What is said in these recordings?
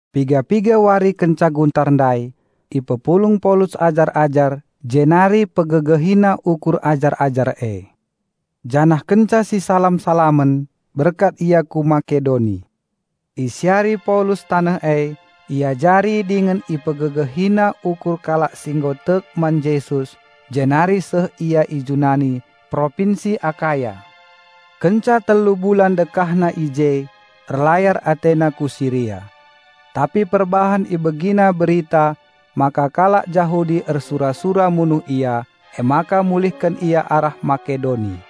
Piga-piga wari kenca guntar ndai ipepulung Paulus ajar-ajar jenari pegegehina ukur ajar-ajar e. Janah kenca sisalam-salamen, berkat ia ku Makedoni. Isiari Paulus taneh e, iajari dingen ipegegehina ukur kalak si nggo tek man Jesus jenari seh ia i Junani, Propinsi Akaya. Kenca telu bulan dekahna i je erlayar atena ku Siria. Tapi perbahan ibegina berita maka kalak Jahudi ersura-sura munuh ia, emaka mulihken ia arah Makedoni.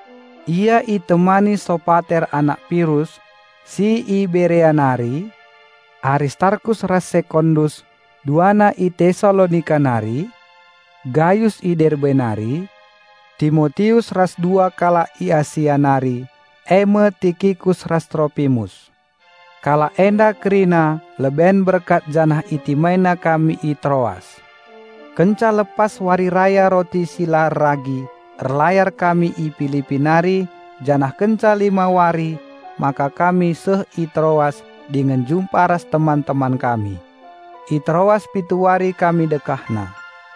Ia itemani Sopater anak Pirus si i Berea nari, Aristarkus ras Sekondus duana i Tesalonika nari, Gayus i Derbe nari, Timotius ras dua kalak i Asia nari eme Tikikus ras Tropimus. Kalak enda kerina leben berkat janah itimaina kami i Troas. Kenca lepas Wari Raya Roti si la erragi erlayar kami i Pilipi nari janah kenca lima wari maka kami seh i Troas dingen jumpa ras teman-teman kami. I Troas pitu wari kami dekahna.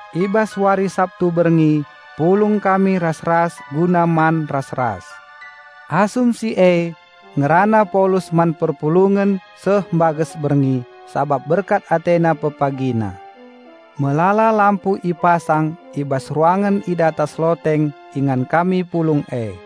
I bas wari Sabtu berngi pulung kami ras-ras guna man ras-ras. Asum si e ngerana Paulus man perpulungen seh mbages berngi, sabap berkat atena pepagina. Melala lampu ipasang i bas ruangen i datas loteng ingan kami pulung e.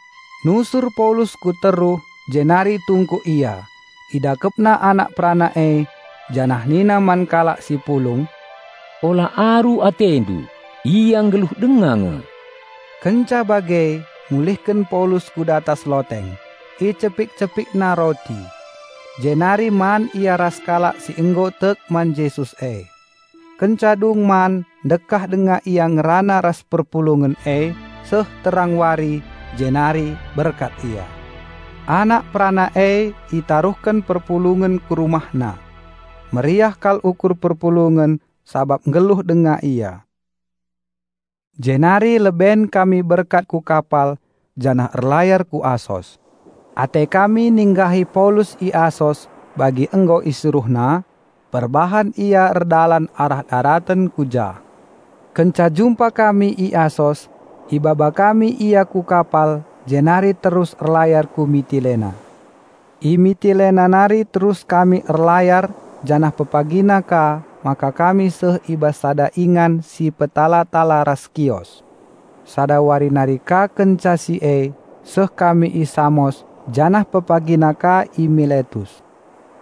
Nusur Paulus ku teruh jenari tungkuk ia, idakepna anak perana e janah nina man kalak si pulung, "Ula aru atendu, ia nggeluh denga nge." Kenca bage mulihken Paulus ku datas loteng, icepik-cepikna roti. Jenari man ia ras kalak si nggo tek man Jesus e. Kenca dung man ndekah denga ia ngerana ras perpulungen e, seh terang wari, jenari berkat ia. Anak perana e itaruhken perpulungen ku rumahna. Meriah kal ukur perpulungen sabab nggeluh denga ia. Jenari leben kami berkat ku kapal janah erlayar ku Asos. Ate kami ninggahi Paulus i Asos bagi nggo isuruhna, perbahan ia erdalan arah daraten ku jah. Kenca jumpa kami i Asos, ibaba kami ia ku kapal jenari terus erlayar ku Mitilena. I Mitilena nari terus kami erlayar janah pepagina ka maka kami seh i bas sada ingan si petala-tala ras Kios. Sada wari nari ka kenca si e seh kami i Samos janah pepagina ka i Miletus.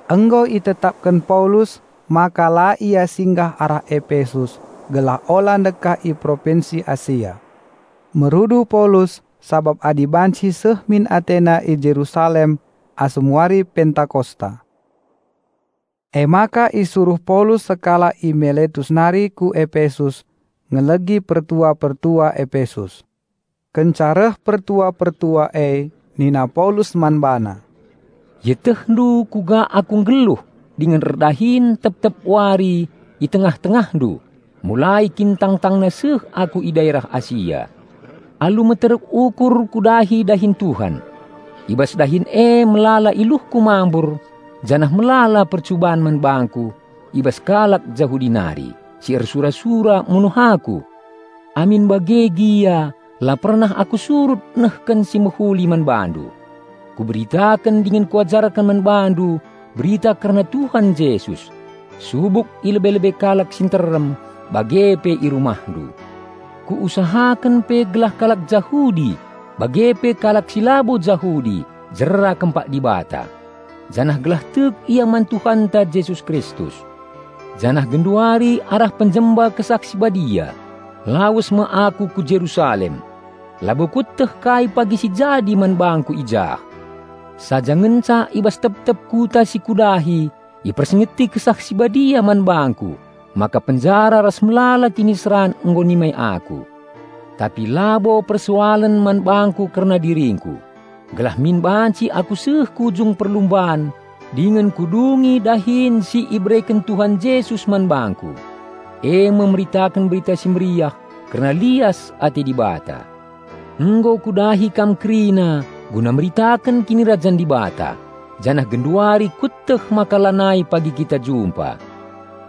Nggo itetapken Paulus maka la ia singgah arah Epesus gelah ula ndekah i Propinsi Asia. Merudu Paulus sabap adi banci seh min atena i Jerusalem asum wari Pentakosta. Emaka isuruh Paulus sekalak i Miletus nari ku Epesus ngelegi pertua-pertua Epesus. Kenca reh pertua-pertua e nina Paulus man bana, "Ietehndu kuga aku nggeluh dingen erdahin tep-tep wari i tengah-tengahndu mulai kin tangtangna seh aku i daerah Asia. Alu meteruk ukur kudahi dahin Tuhan. I bas dahin e melala iluhku mambur janah melala percuban man bangku i bas kalak Jahudi nari, si ersura-sura munuh aku. Amin bage gia la pernah aku surut nehken si mehuli man bandu. Kuberitaken dingen kuajarken man bandu berita kerna Tuhan Jesus, subuk i lebe-lebe kalak si nterem, bage pe i rumahndu. Kuusahaken pe gelah kalak Jahudi bage pe kalak si labo Jahudi jera kempak Dibata, janah gelah tek ia man Tuhanta Jesus Kristus. Janah genduari arah penjemba Kesah Si Badia, lawes me aku ku Jerusalem. Labo kueteh kai pagi si jadi man bangku i jah. Saja ngenca i bas tep-tep kuta si kudahi ipersingeti Kesah Si Badia man bangku maka penjara ras melala kiniseran nggo nimai aku. Tapi labo persoalen man bangku kerna diringku, gelah min banci aku seh ku ujung perlumban dingen kudungi dahin si ibereken Tuhan Jesus man bangku, eme meritaken Berita Si Mehuli kerna lias ate Dibata. Nggo kudahi kam kerina guna meritaken Kinirajan Dibata. Janah genduari kueteh maka lanai pagi kita jumpa.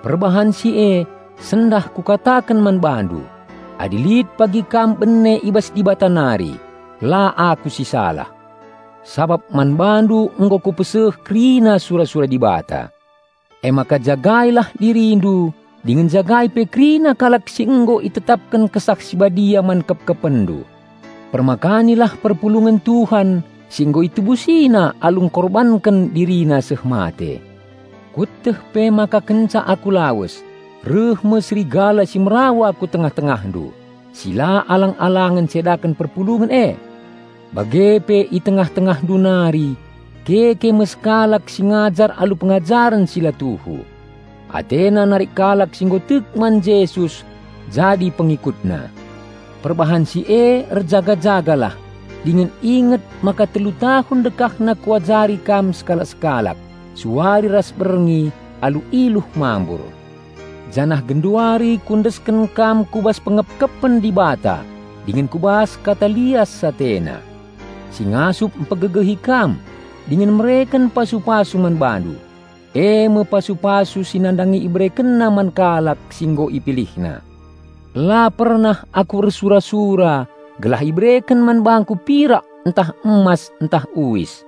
Perbahan si e, i sendal kukataken man bandu: adi lit pagi kam bene i bas Dibata nari, la aku si salah. Sabap man bandu nggo kupeseh kerina sura-sura Dibata. Emaka jagailah dirindu dingen jagai pe kerina kalak si nggo itetapken Kesah Si Badia man kepkepenndu. Permakanilah perpulungen Tuhan si nggo ItebusiNa alu engkorbanken DiriNa seh mate. Kueteh pe maka kenca aku lawes, reh me serigala si merawa ku tengah-tengahndu si la alang-alangen ncedaken perpulungen e. Bage pe i tengah-tengahndu nari keke me kalak si ngajar alu pengajaren si la tuhu. Atena narik kalak si nggo tek man Jesus jadi pengikutna. Perbahan si e erjaga-jagalah dingen inget maka telu tahun dekahna kuajari kam sekalak-sekalak suari ras berngi alu iluh mambur. Janah genduari kuendesken kam ku bas pengepkepen Dibata dingen ku bas Kata lias AteNa, si Ngasup mpegegehi kam dingen mereken pasu-pasu man bandu, eme pasu-pasu si nandangi IberekenNa man kalak si nggo IpilihNa. La pernah aku ersura-sura gelah ibereken man bangku pirak ntah emas ntah uis.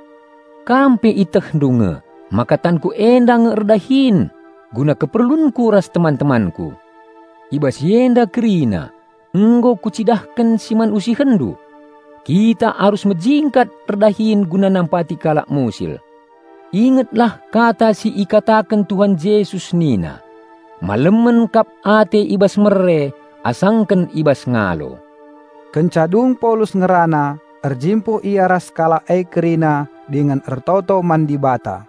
Kam pe ietehndu nge maka tanku enda nge erdahin guna keperlunku ras teman-temanku. I bas si enda kerina, nggo kucidahken si man usihenndu. Kita arus mejingkat erdahin guna nampati kalak musil. Ingetlah kata si ikataken Tuhan Jesus nina, 'Malemen kap ate mere asangken ngalo.'" Kenca dung Paulus ngerana erjimpuh ia ras kalak e kerina dingen ertoto man Dibata.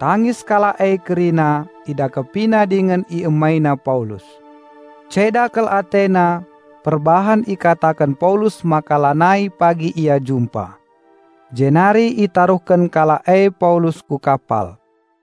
Tangis kalak e kerina, idakepina dingen iemaina Paulus. Ceda kal atena perbahan ikataken Paulus maka lanai pagi ia jumpa. Jenari itaruhken kalak e Paulus ku kapal.